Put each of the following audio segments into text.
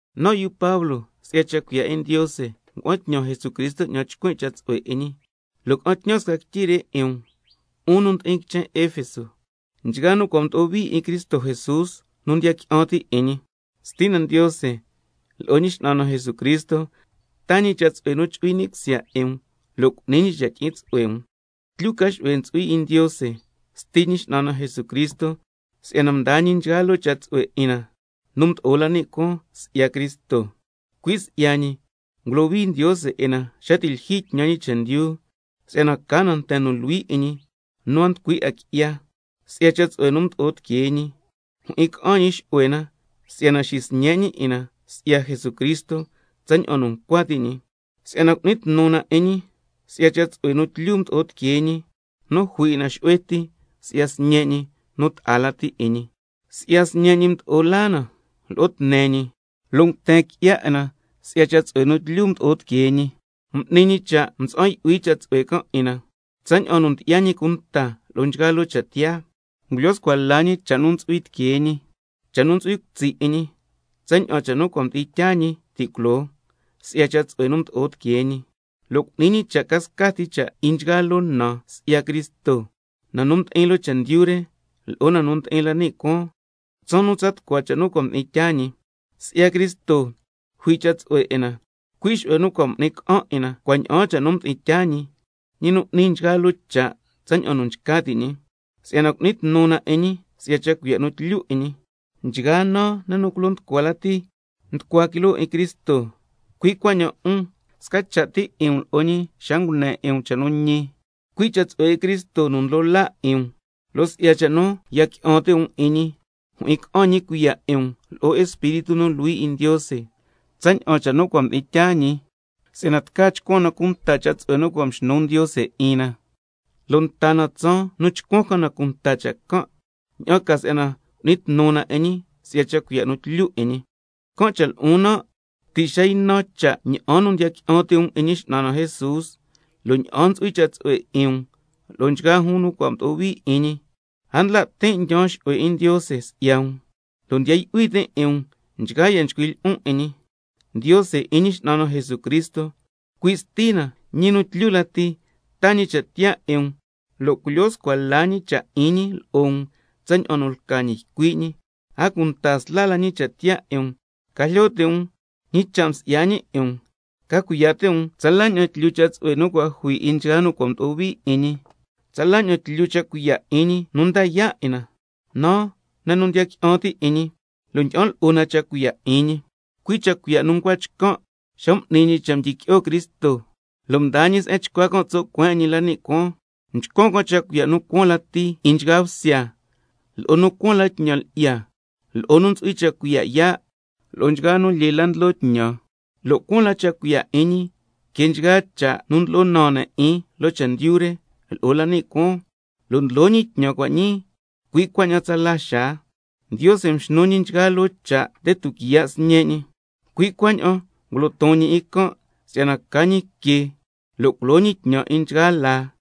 Nan' yu Pablo, si'ya cha' cuiya' 'in Ndiose ngua'an tñan Jesucristo 'ñan tsa ycuin' cha' tsu'hue 'in ñi, lo' ca'an tñan sca quityi re 'in um, 'un nu ndi'in quichen Efeso, nchgaa nu cua' mdo'o hui 'in Cristo Jesús nu ndiya qui'an ti' 'in ñi. Stina Ndiose lo'o Ñi X'nan na Jesucristo taa ñi cha' tsu'hue nu chu'hui ni' cusya 'in um, lo' cu'ni ñi cha' tyi'in tsu'hue um. Tlyu ca xu'hue ntsu'hui 'in Ndiose, Sti Ñi X'nan na Jesucristo, si'yana mdaa ñi nchgaa loo cha' tsu'hue 'in na nu mdo'o la ni' cuaan si'ya Cristo. Cui' si'ya ñi ngulohui Ndiose 'in na xa nu ti' lyijyi tñan ñi chendyu, si'yana ca na nten nu luhui 'in ñi nu a nducui 'a qui'ya. Si'ya cha' tsu'hue nu mdo'o tiquee ñi, mjyi'in ca'an ñi xu'hue na si'yana xisñe' ñi 'in na si'ya Jesucristo tsaña'an nu ncua ti' ñi, ña'an ca si'yana cu'ni tnu na 'in ñi si'ya cha' tsu'hue nu tlyu mdo'o tiquee ñi, nu jui 'in na xu'hue ti si'ya Sñe' ñi nu ta'a lati 'in ñi. Si'ya Sñe' ñi mdo'o laa na lo'o tne ñi, lo' nguten qui'ya 'in na si'ya cha' tsu'hue nu tlyu mdo'o tiquee ñi, m'ni ñi cha' mtsa'an yu'hui cha' tsu'hue can' 'in na, tsaña'an nu ndyi'ya ñi cunta lo'o nchgaa loo cha' tiyaa, ngulyo scua la ñi cha' nu ntsu'hui tiquee ñi, cha' nu yu'hui cutsi' 'in ñi, tsaña'an cha' nu cua' mdi'in tyaa ñi ti' culoo, si'ya cha' tsu'hue nu mdo'o tiquee ñi, lo' cu'ni ñi cha' ca scati cha' 'in nchgaa loo na si'ya Cristo, na nu ndi'in loo chendyu re lo'o na nu ndi'in la ni' cuaan, tsaan nu tsa tucua cha' nu cua' mdi'in tyaa ñi. Cui' si'ya Cristo jui cha' tsu'hue 'in na, xu'hue nu cua' m'ni ca'an 'in na cua' ña'aan cha' nu mdi'in tyaa ñi, ñi nu n'ni nchgaa loo cha' tsaña'an nu nchca ti' ñi, ña'an ca si'yana cu'ni tnu na 'in ñi si'ya cha' cuiya' nu tlyu 'in ñi, nchgaa naa ne' nu culo nducua lati nducua quiloo 'in Cristo. Cui' cuaña'an 'un, sca cha' ti 'in um lo'o ñi ti' xa ngune 'in um cha' nu ñi can', cui' cha' tsu'hue 'in Cristo nu ndlo laa 'in um, lo' si'ya cha' nu ya qui'an ti' um 'in ñi, mjyi'in ca'an ñi sca cuiya' 'in um lo'o Espíritu nu Luhui 'in Ndiose tsaña'an nu cua' mdi'in tyaa ñi cha', si'yana tca chcuan na cunta cha' tsu'hue nu cua' mxnu Ndiose 'in na, lo' nta na tsaan nu chcuan ca na cunta cha' can', ña'an ca si'yana cu'ni tnu na 'in ñi si'ya cha' cuiya' nu tlyu 'in ñi. Can' cha' lo'on nan', ti' xa ynan cha' ña'an nu ndiya qui'an ti' um 'in Ñi X'nan na Jesús, a cunta si'yana ntsu'hui cha' tsu'hue 'in um lo'o nchgaa jun nu cua' mdo'o hui 'in ñi, a ndla' tin' ndyaan xu'hue 'in Ndiose si'ya um, lo' ndiya yu'hui tin' 'in um nchgaa ya' nchcuin' lyi'on 'in ñi, si'yana Ndiose 'in Ñi X'nan na Jesucristo, cui' Stina ñi nu tlyu lati, taa ñi cha' tiyaa 'in um lo' culyo scua la ñi cha' 'in ñi lo'o um tsaña'an nu lca ñi ycui' ñi. A cunta sla la ñi cha' tiyaa 'in um, ca jlyo ti' um ñi cha' msi'ya ñi 'in um, ca cuiya' ti' um tsala ña'an tlyu cha' tsu'hue nu cua' jui 'in nchgaa nu cua' mdo'o hui 'in ñi, tsala ña'an tlyu cha' cuiya' 'in ñi nu nda yaa' 'in na, naa ne' nu ndiya qui'an ti' 'in ñi, lo' ndyi'an lo'o na cha' cuiya' 'in ñi, cui' cha' cuiya' nu ncua chcan' xa m'ni ñi cha' mdyiqui'o Cristo, lo' mdaa ñi se'en chcua can' tso' cueen 'in ñi la ni' cuaan, mchcuan can' cha' cuiya' nu cuaan lati 'in nchgaa bsya, lo'o nu cuaan la tñan lyi'ya, lo'o nu ntsu'hui cha' cuiya' yaa', lo'o nchgaa nu lyee la ndlo tñan, lo' cuaan la cha' cuiya' 'in ñi que nchgaa cha' nu ndlo'o naan ne' 'in loo chendyu re lo'o la ni' cuaan, lo' ndlo ñi tñan cua' ñii, cui' cuaña'an tsala xaa. —Ndiose mxnu ñi nchgaa loo cha' nde tuquiya' Sñe' ñi—, cui' cuaña'an ngulo ton ñi 'in can' si'yana ca ñi que lo' culo ñi tñan 'in nchgaa laa,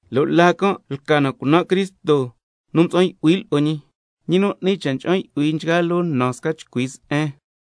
lo' laa can' lca na cunan' Cristo nu mtsa'an yu'hui lo'o Ñi, ñi nu n'ni cha' cha'an yu'hui nchgaa loo na sca chcui se'en.